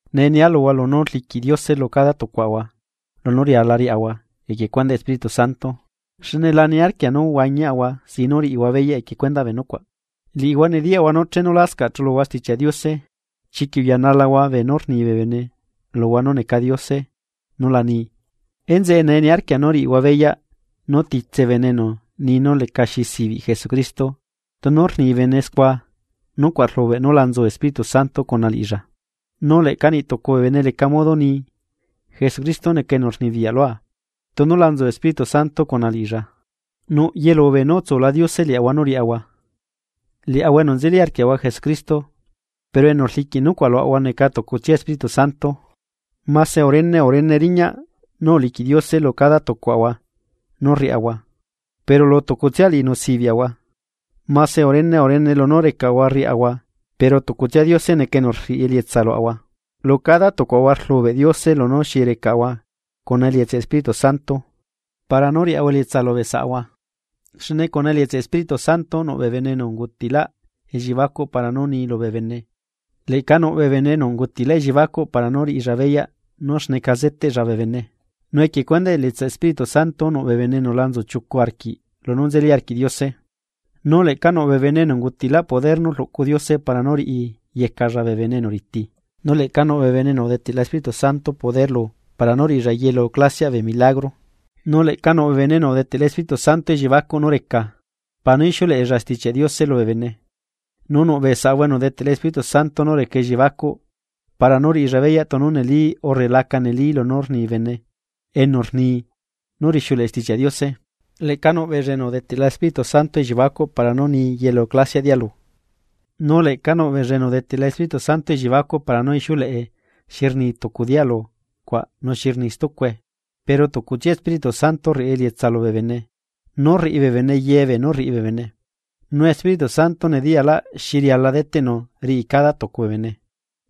Nee nia luhua lunú rliquiꞌ Diose lu cada tucuaꞌahua lunú riala riaꞌahua equie cuendaꞌ Espíritu Santo, xne la niarquia nú huañiaꞌahua sin nú riꞌihua beyaꞌ equie cuendaꞌ bee nucuaꞌ. Liꞌihua nediyaꞌhua nú chenu lascaꞌ chuluhua Stichiaꞌ Diose, chiquiꞌ uyanalahua bee enu rni bee bene luhua nú neca diose nu la ni. Enzeꞌe nee niarquia nú riꞌihua beyaꞌ, nú titse bene enu nii nú lecaxi sibiꞌ Jesucristo, tunu rni bene scua nucuaꞌ rlubeꞌ nú la nzu Espíritu Santo cuna liꞌilla. Nu leꞌca niꞌtucu bee bene leca modo nii: “Jesucristo neca enu rnibiyaꞌ lua.” Tunu la nzu Espíritu Santo cuna liꞌilla. Nuꞌ yelu beenú utsula Diose liaꞌahua nú riaꞌahua, liaꞌahua enu nzelila arquiaꞌahua Jesucristo, pero enu rliquiꞌ nucuaꞌ luaꞌahua neca tucutsia Espíritu Santo. Mase urene urene riñaꞌ nú uliquiꞌ Diose lu cada tucuaꞌahua nú rriaꞌahua, pero lu tucutsia liꞌinu sibiaꞌahua. Mase urene urene lunú recaꞌahua rriaꞌahua pero tucutsia Diose neca enu rriꞌi elietsa luaꞌahua. Lu cada tucuaꞌahua rlubeꞌ Diose lunú xi recaꞌahua cuna elietsaꞌ Espíritu Santo para nú riaꞌahua elietsa lubee saꞌahua. Xne cuna elietsaꞌ Espíritu Santo nuꞌ bee bene enu ungutiꞌlaꞌ elliebacuꞌ para nú ni lubee bene, leꞌca nuꞌ bee bene enu ungutiꞌlaꞌ elliebacuꞌ para nú riꞌilla beyaꞌ nú xneca zeteꞌlla bee bene. Nu equie cuendaꞌ elietsaꞌ Espíritu Santo nuꞌ bee bene enu la nzuchiucu arquiꞌ lunú nzeli arquiꞌ Diose. Nu leꞌca nuꞌ bee bene enu ungutiꞌlaꞌ poder nú rluꞌcu Diose para nú riꞌi yecalla bee bene enu riti. Nu leꞌca nuꞌ bee bene enu udeteꞌla Espíritu Santo poder lu para nú riꞌilla yelu clasiaꞌ bee milagro. Nu leꞌca nuꞌbee bene enu udeteꞌla Espíritu Santo elliebacuꞌ nú reca, para nú ixiuleꞌella Stichiaꞌ Diose lubee bene, nu nuꞌ bee saꞌahua enu udeteꞌla Espíritu Santo nú reca elliebacuꞌ para nú riꞌilla beyaꞌ tunu neli urre laca neli lunú rni bene enu rni nú rixiuleꞌe Stichiaꞌ Diose. Leꞌca nuꞌ beella enu udeteꞌla Espíritu Santo elliebacuꞌ para nú ni yelu clasiaꞌ dialu, nu leꞌca nuꞌ beella enu udeteꞌla Espíritu Santo elliebacuꞌ para nú ixiuleꞌe xi rni tucu dialu cuaꞌ nu xi rni stucue. Pero tucutsia Espíritu Santo rriꞌi elietsa lubee bene nú rriꞌi bee bene ye beenú rriꞌi bee bene, nu Espíritu Santo nediyalaꞌ xi riala deteꞌnu riꞌi cada tucu bee bene.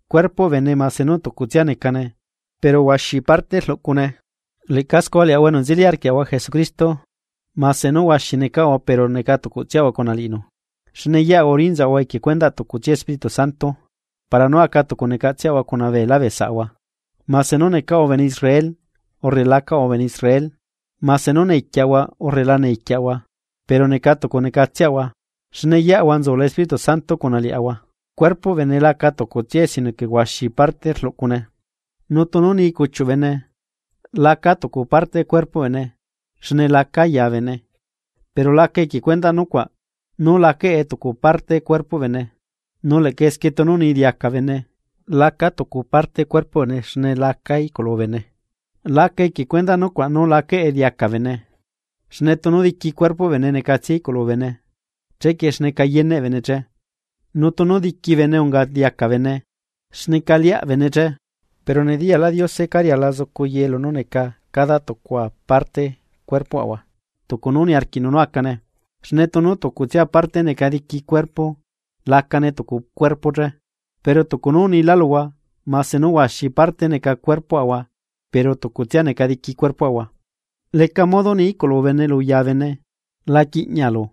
Cuerpoꞌ bene mase nú tucutsia necane pero huaxi parte rluꞌcune. Leꞌca scua liaꞌahua enu nzeli arquiaꞌahua Jesucristo mase nú huaxi necaꞌahua pero neca tucutsiaꞌahua cuna liꞌinu. Xne yeꞌahua urinzaꞌahua equie cuendaꞌ tucutsia Espíritu Santo, para nú aca tucu necatseꞌahua cuna beelá bee saꞌahua, mase nú necaꞌahua bene Israel urre lacaꞌahua bene Israel, mase nú necaꞌahua esclavo urre lacaꞌahua esclavo, pero neca tucu necatselaꞌahua xne yeꞌahua nzula Espíritu Santo cuna liaꞌahua. Cuerpoꞌ bene laca tucutsiae sino que huaxi parte rluꞌcune. Nu tunu ni cuchiuꞌ bene: “Lacaa tucu parte cuerpoꞌ bene xne lacaa ya bene.” Pero laca equie cuendaꞌ nucuaꞌ nú lacaꞌe tucu parte cuerpoꞌ bene. Nu leꞌca esquie tunu ni diaca bene: “Lacaa tucu parte cuerpoꞌ bene xne lacaa iꞌculu bene”, laca equie cuendaꞌ nucuaꞌ nú lacaꞌe diaca bene. Xne tunu diqui cuerpoꞌ bene necatsia iꞌculu bene, ¿chequie xneca yeneꞌ bene che? Nu tunu diqui bene unga diaca bene, ¿xneca liaꞌ bene che? Pero nediyalaꞌ Diose cá riala zucu ye lunú neca cada tucua parte cuerpoꞌahua, tucu nú niarquiꞌnu nú acane. Xne tunu tucutsia parte neca diqui cuerpo lacane tucu cuerpo che. Pero tucu nú unilá luhua mase nú huaxi parte neca cuerpoꞌahua pero tucutsia neca diqui cuerpoꞌahua. Leca modo ni iꞌculu bene luya bene: “La quiꞌñalu.”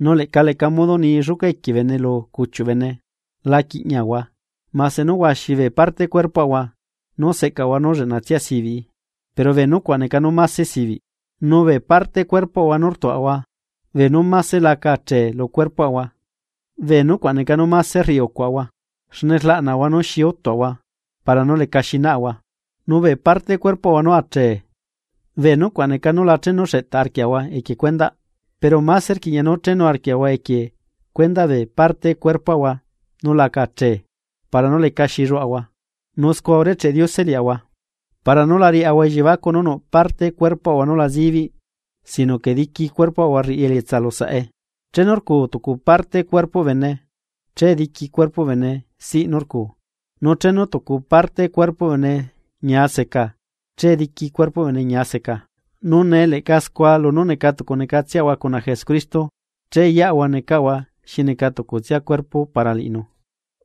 Nu leꞌca leca modo ni lluca equie bene lu cuchiuꞌ bene: “La quiꞌñiahua.” Mase nú huaxi bee parte cuerpoꞌahua nú seꞌcaꞌahua nú lleꞌnatsia sibiꞌ, pero bee nucuaꞌ neca nú máse sibiꞌ. Nu bee parte cuerpoꞌahua nú rtuaꞌahua mase la aca achee lu cuerpoꞌahua bee nucuaꞌ neca nú máse rriꞌi ucuaꞌahua xne rlaꞌnaꞌahua nú xi utuaꞌahua para nú lecaxi naꞌahua. Nu bee parte cuerpoꞌahua nú ache, bee nucuaꞌ neca nú la chenu xeꞌtaꞌ arquiaꞌahua equie cuendaꞌ. Pero máse rquiꞌña nú chenu arquiaꞌahua equie cuendaꞌ bee parte cuerpoꞌahua nú la achee para nú lecaxi lluaꞌahua, nu scua urecheꞌ Diose liaꞌahua. Para nú la riaꞌahua elliebacuꞌ nú nuꞌ parte cuerpoꞌahua nú la zibiꞌ sino que diqui cuerpoꞌahua rriꞌi elietsa lu saꞌe. Chenu rcuu tucu parte cuerpoꞌ bene, che diqui cuerpoꞌ bene siꞌ nú rcu, nu chenu tucu parte cuerpoꞌ bene ñia seca che diqui cuerpoꞌ bene ñia seca. Nu nee leꞌca scua lunú neca tucu necatseꞌahua cuna Jesucristo, che yeꞌahua necaꞌahua xi neca tucutsia cuerpo para liꞌinu,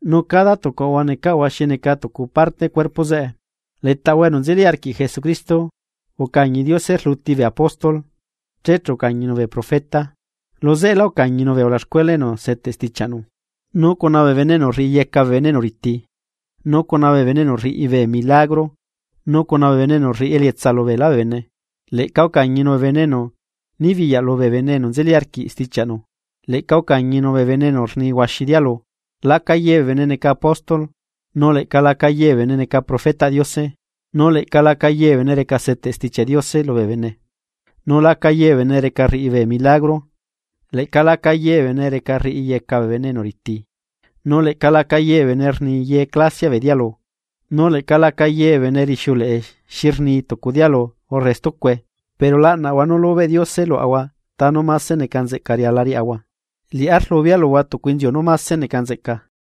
nu cada tucuaꞌahua necaꞌahua xi neca tucu parte cuerpo zeꞌe. Letaꞌahua enu nzeli arquiꞌ Jesucristo ucañi Diose rluti bee apóstol, che chu ucañinu bee profeta, luzeꞌela ucañinu bee ulaxcuela enu seteꞌ stichiaꞌnu, nu cuna bee bene enu rriꞌiyeca bee bene enu riti, nu cuna bee bene enu rriꞌi bee milagro nu cuna bee bene enu rriꞌi elietsa lubeela bee bene. Leꞌca ucañinu bee bene enu nibiyaꞌ lubee bene enu nzeli arquiꞌ stichiaꞌnu, leꞌca ucañinu bee bene enu rni huaxi dialu. Laca ye bee bene neca apóstol nu leꞌca laca ye bee bene neca profetaꞌ Diose nu leꞌca laca ye bee bene reca seteꞌ Stichiaꞌ Diose lubee bene, nu laca ye bee bene reca rriꞌi bee milagro. Leꞌca laca ye bee bene reca rriꞌiyeca bee bene enu riti, nu leꞌca laca ye bee bene reca rni ye clasiaꞌ bee dialu, nu leꞌca laca ye bee bene reca rixiuleꞌe xi rni tucu dialu urre stucue. Pero laꞌnahua nú lubeꞌ Diose luaꞌahua ta nú mase neca nzeꞌca riala riaꞌahua, liꞌá rlubea luhua tucu inziu nú máse neca nzeꞌca.